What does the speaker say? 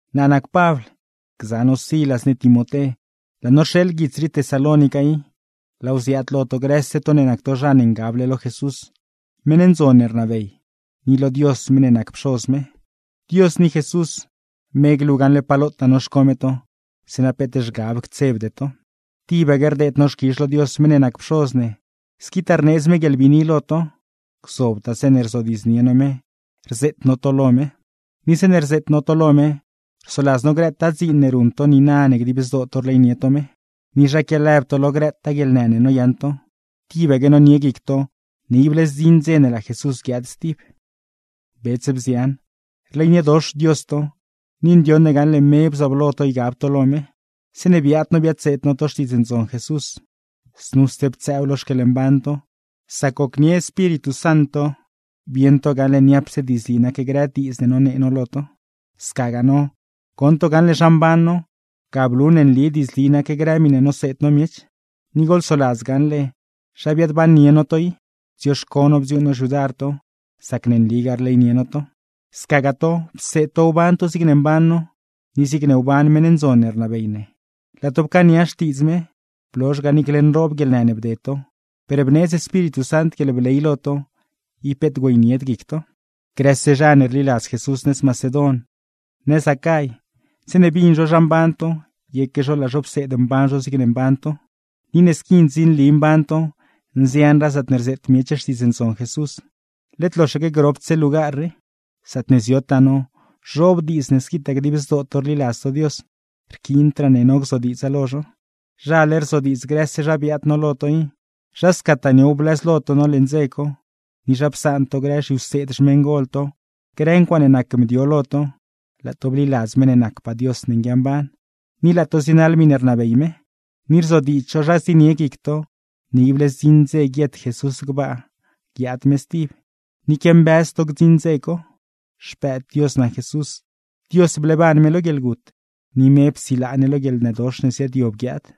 Naa nac Pabl, gza no Silas ni Timoté, laa no rxeeḻ guits rii Tesalónica i; laaw ziaad lo to grëse to ne nac to zha ne ngable lo Jesús, meṉ ndzon ne rnabey, ni lo Dios meṉ ne nac Pxoz ne. Dios ni Jesús, me glu gaṉle pa lotaa noxco me to, zeeṉa peet zhgab ctsebde to. Tibaque rdeed no xquizh lo Dios meṉ ne nac Pxoz ne, squitaa rneedz me guieḻbiini lo to; gzobtaa zeeṉe rzodiidznie no me rzeet no to lo me. Ni zeeṉe rzeet no to lo me, rsoladz no grëtaa dziin ne ruṉ to niina ne dib zdoo to rleynie to me, ni zha quialëb to lo grëtaa guieḻnë ne noyaṉ to, tibaque nonie guic to ne ible zdziṉ dze ne laa Jesús guiaad stib. Bets, bzian, rleyniedox Dios to, ni ndioṉ ne gaṉle me bzooblo to ygab to lo me. Zeeṉe biaad no biadseed no to Xtiidz Ndzon Jesús, znuse ptsëëw lo xquieḻmban to, sac gocnie Espíritu Sant to bieṉ to gaṉle niapse diidzli nac grë diidz ne nonee no lo to; scagaa no, goṉ to gaṉle zha mban no, ga blu ne nli diidzli nac grë miṉe noseed no miech. Ni goḻsoladz gaṉle zha biaadbannie no to i, bdzioxco no bdziuuṉ no xyudar to, sac ne nligaa rleynie no to. Scagaa to, pseed to wban to zigne mban no, ni zigne wban meṉ ndzon ne rnabey ne. Laa to pcaania xtiidz me, blozh ga, niicle nroob guieḻnë ne bded to, per bneedz Espíritu Sant guieḻbley lo to, ib peet güeynied guic to. Grëse zha ne rliladz Jesús nëz Macedon, nëz Acay, zeeṉe bin zho zha mban to, yeque zho laa zho pseed mban zho zigne mban to. Ni ne squi ndzinli mban to, nzianraa zaatne rzeet miech Xtiidz Ndzon Jesús, led loxaque gropdse lugar rii. Zaatne ziotaa no, zhoob diidz ne squitaa dib zdoo to rliladz to Dios, rquiindraa ne no gzodiidza lo zho. Zhale rzodiidz grëse zha biaad no lo to i, zha scataa niow blëzlo to no leṉ dze co, ni zha psaan to grë zhiwseed xmeṉgol to, grë ncuaaṉe nac mdio lo to, laa to bliladz meṉ ne nacpaa Dios ne nguiamban, ni laa to zienaḻ miṉe rnabey me. Ni rzodiidz zho zha zienie guic to ne ible zdziṉ dze guiet Jesús gbaa guiaad me stib, ni quiambëz to gdziṉ dze co. Xpëëd Dios nac Jesús, Dios bleeban me lo guieḻgut, ni me psilaa ne lo guieḻnëdox ne ziaadyob guiaad.